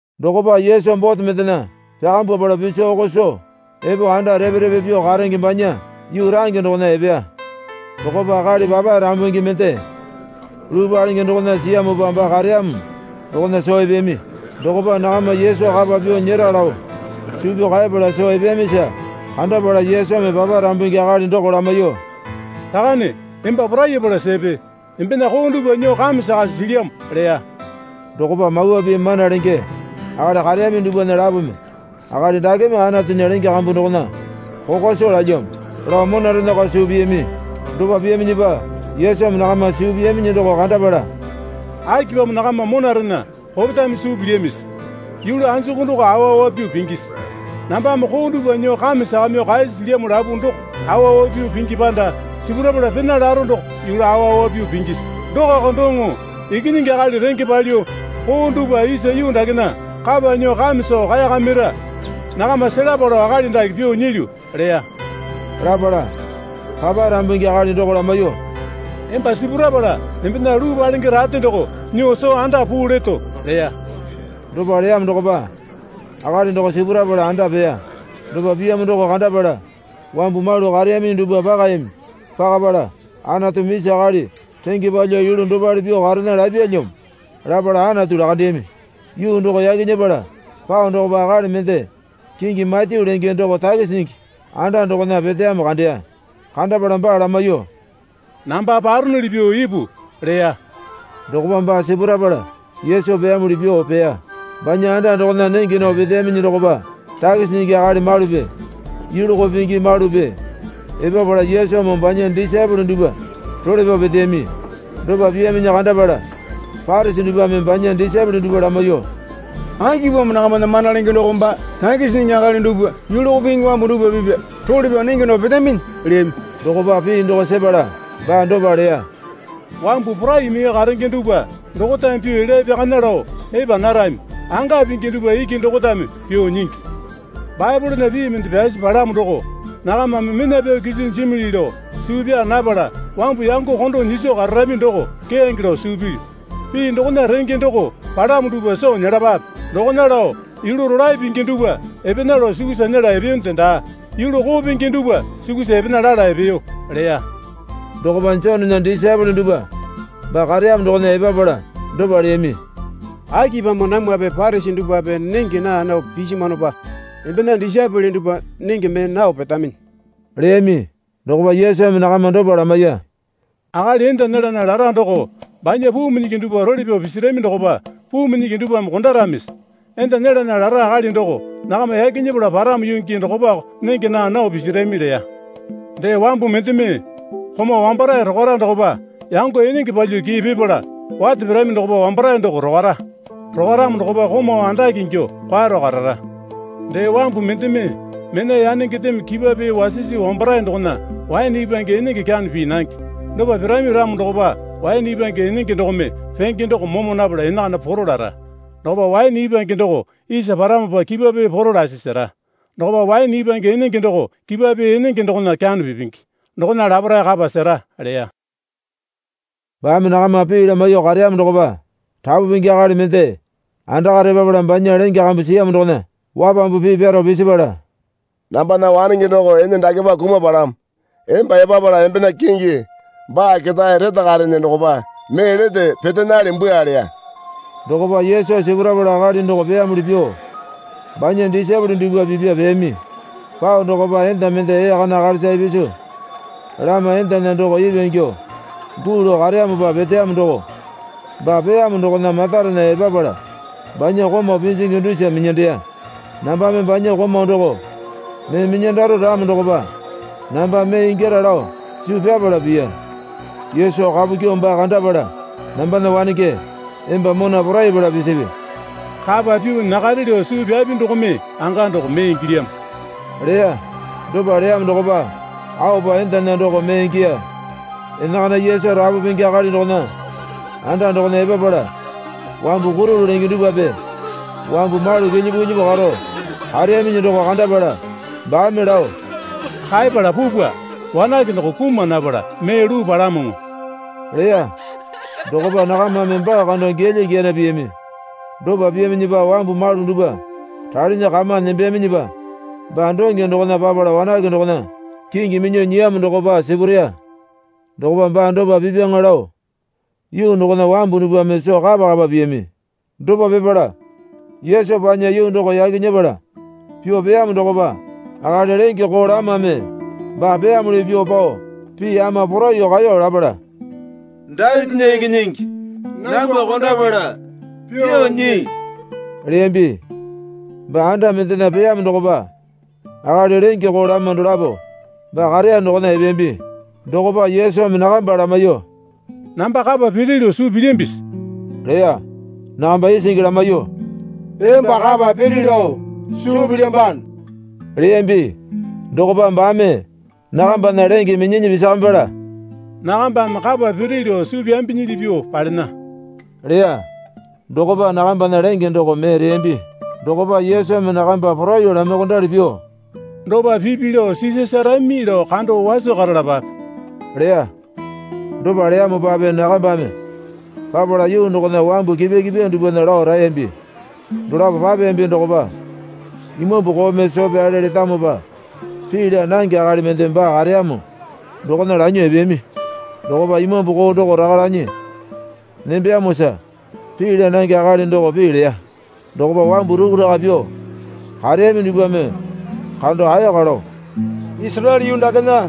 Dokopa Yesu bote mendena pyakambwapala piso oko soo epo anda repe repe pyuo karenge banya yuu range dokona epeya. Dokopa akali papae rambungi mende luu palenge dokona siyamopa baa kareyamo dokona soo epeyami. Dokopa nakama Yesu kapa pyuo nyera lao suu pyao kaepala soo epeyamisa, kandapala Yesumi papae rambungi akali doko lamaiyuo, Rakane, emba porayapala sepe. Embena koo dupwa nyuo kame sakasi silyamo, leya. Dokopa Mawa Pii mana lenge akali kareyami dupwana lapome, Akali dakeme Anatunya lenge kambu dokona kokwa soo lalyamo, lao monarenako suu piyami. Dopa piyaminyipa Yesumi nakama suu piyaminyi doko kandapala, Akipamo nakama monarena kopetame suu pilyamisi? Yulu anjuku doko awa awa pyuo pingisi? Nambame koo dupwa nyuo kame sakamyuo kaeyasi silyamo lapu doko awa awa pyuo pingi panda sipurapala pena laro doko yulu awa awa pyuo pingisi? Dokako doŋo Ikinyingi Akali renge palyuo koo dupwa isa yuu dakena kapa nyuo kame soo kaeyakamira nakama selapa lao akali dake pyuo nyilyu, leya. Lapala papae rambungi akali doko lamaiyuo, Emba sipurapala embena luu palenge rate doko nyuo soo anda puu leto, leya. Dopa leyamo dokopa akali doko sipurapala anda peya. Dopa piyamo doko kandapala wambu malu kareyaminyi dupwa pakayami. Pakapala, Anatumi isa akali renge palyuo yulu dopale pyuo karena lapyalyamo, lapala Anatu lakandeyami. Yuu doko yaki nyepala pao dokopa akali mende kingi Matyu lenge doko takisi nyingi anda dokona peteyamo kandeya. Kandapala baa lamaiyuo, Namba paronuli pyuo ipu, leya. Dokopa baa sipurapala Yesu peyamuli pyuo peya. Banya anda dokona nenge nao peteyaminyi dokopa takisi nyingi akali malupi yulu koo pingi malupi epapala Yesumoo banya disaepole dupwa role pyao peteyami. Dopa piyaminyi kandapala Parisi dupwame banya disaepole dupwa lamaiyuo, Akipamo nakamana mana lenge doko baa takisi nyingi akali dupwa yulu koo pingi wambu dupwa pipa role pyao nenge nao petaminyi? leyami. Dokopa pii doko sepala baa dopa leya. Wambu porai mee karenge dupwa dokotame pyuo elya pyakana lao epa narami. Anga pingi dupwa iki dokotame pyuo nyingi. Baepolena pii mende pyasi palamo doko, Nakamame mena pyao kiso jimili lao suu pyaa napala wambu yango kondo nyiso kararami doko keyange lao suu pilyu. Pii dokona renge doko palamo dupwa soo nyelapape. Dokona lao yulu rolae pingi dupwa epena lao sukusa nyela epeyonde daa, yulu koo pingi dupwa sukusa epena lala epeyo, leya. Dokopa Jonena disaepole dupwa baa kareyamo dokona epapala dopa leyami. Akipamo namwape Parisi dupwape nenge naa nao pisimwanopa embena disaepole dupwa nenge mee nao petaminyi? leyami. Dokopa Yesumi nakama dopa lamaiya. Akali enda nyelana lara doko banya puu minyingi dupwa role pyao pisirami dokopa puu minyingi dupwame kondaramisi? Enda nyelana lara akali doko nakama yaki nyepala paramo yuu gii dokopako nenge naa nao pisirami leya. Dee wambu mendeme komau wambarae rokwara dokopa yango enenge palyuo kii pipala wate pirami dokopa wambarae doko rokwara. Rokwaramo dokopa komau andake ingyuo kwaro karara. Dee wambu mendeme mena yanengendeme kipwa pee wasisi wambarae dokona waene ipwange enenge kyano pii nange. Dopa pirami ramo dokopa waene ipwange enenge dokome penge doko momo napala enakana poro lara. Dokopa waene ipwange doko isa paramopa kipwa pee poro lasi sera. Dokopa waene ipwange enenge doko kipwa pee enenge dokona kyano pipingi. Dokona laparae kapa sera leya. Baame nakama pii lamaiyuo kareyamo dokopa rapu pingi akali mende andakare epapala banya lenge kambu siyamo dokona wapambu pii pyaro pisipala, Nambana wanenge doko ene dakepa kumapalamo. Emba epapala embena kingi baa ketae retakarene dokopa mee lete petenale bwua leya. Dokopa Yesu sipurapala akali doko peyamuli pyuo banya disaepole dupwa pipya peyami. Pao dokopa enda mende ee kana akalisa ipisu lama endana doko ipwa ingyuo guu lao kareyamopa peteyamo doko baa peyamo dokona matarena epapala banya komau pinjingi dusa minyandeya. Nambame banya komau doko mee minyandaro ramo dokopa namba mee ingyara lao suu pyapala piya. Yesu kapu kyuo baa kandapala, Nambana wanenge, emba mona porayapala pisipi. Kapa pyuo nyakare lao suu pyapi dokome anga doko mee ingilyamo, leya. Dopa leyamo dokopa aopa endana doko mee ingiya. Enakana Yesu rapu pingi akali dokona anda dokona epapala wambu kurulu lenge dupwape wambu malu kilyipu kilyipu karo kareyaminyi doko kandapala baame lao, Kaepala pupwa. Wanake doko kuma napala mee luu palamoŋo leya. Dokopa nakamame baa kando gilya giyana piyami. Dopa piyaminyipa wambu malu dupwa ralinyi kama nembeyaminyipa baa donge dokona papala wanake dokona kingi minyuo nyiyamo dokopa sipureya. Dokopa baa dopa pipyaŋa lao yuu dokona wambu dupwame soo kapa kapa piyami. Dopa pipala Yesu panya yuu doko yaki nyepala pyuo peyamo dokopa akali lenge koo lamame baa peyamuli pyuo pao pii ama poraiyuo kaeyo lapala, Dapitinya ikinyingi, nambwa kondapala pyuo nyii, leyambi. Baa anda mendena peyamo dokopa akali lenge koo lama dolapo baa kareya dokona epeyambi. Dokopa Yesumi nakamba lamaiyuo, Namba kapa piri lao suu pilyambisi? leya. Nakamba isingi lamaiyuo, Emba kapa piri lao suu pilyambano leyambi. Dokopa baame nakambana lenge minyinyi pisakamipala, Nakambame kapa piri lao suu pyambinyili pyuo palena, leya. Dokopa nakambana lenge doko mee reyambi. Dokopa Yesumi nakamba poraiyuo lamaiyuokondali pyuo, Dopa pipi lao sisasarami lao kando waso karalapape, leya. Dopa leyamopape nakambame papala yuu dokona wambu kipwa kipwa dupwana lao raeyambi. Dolapo papeyambi dokopa imambu koome soo pyale letamopa pii laa nange akali mende baa kareyamo dokona lanyuo epeyami. Dokopa imambu koo doko raka lanyi nembeyamosa pii laa nange akali doko pii leya. Dokopa wambu rukuraka pyuo kareyami dupwame kando ayaka lao, Isaraele yuu dakena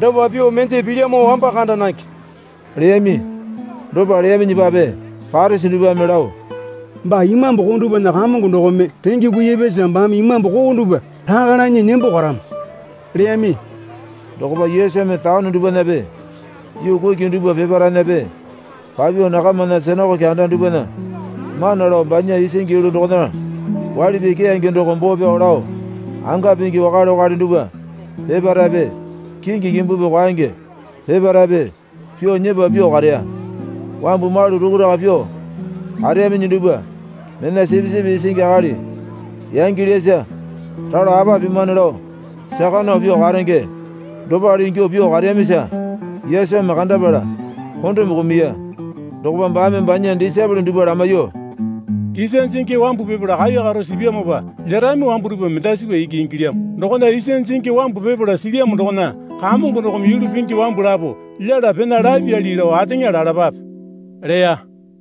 dopa pyuo mende pilyamo wamba kanda nange, leyami. Dopa leyaminyipape Parisi dupwame lao, Baa imambu koo dupwana kamongo dokome renge kuipyasa baame imambu koo dupwa raka lanyi nembo karamo, leyami. Dokopa Yesumi taone dupwanape yuu kuki dupwa peparaenape papyuo nakamana sinakoke anda dupwana mana lao banya isingi yulu dokona waili pii keyange doko boo pyao lao anga pingi wakale wakale dupwa peparaepe kingi kimbupi kwaenge peparaepe pyuo nyepa pyuo kareya. Wambu malu rukuraka pyuo kareyaminyi dupwa mena sipisipi isingi akali yangilyasa ralo apa pimane lao saka nao pyuo karenge dopale ingyuo pyuo kareyamisa Yesumi kandapala kondome kumuya. Dokopa baame banya disaepole dupwa lamaiyuo, Isa jingi wambu pipala kaikaro sipyamopa lyerami wambu dupwa mendasipa iki ingilyamo. Dokona isa jingi wambu pipala silyamo dokona Kamongo dokome yulu pingi wambu lapo lyela pena lapyali lao ateŋa lalapape, leya.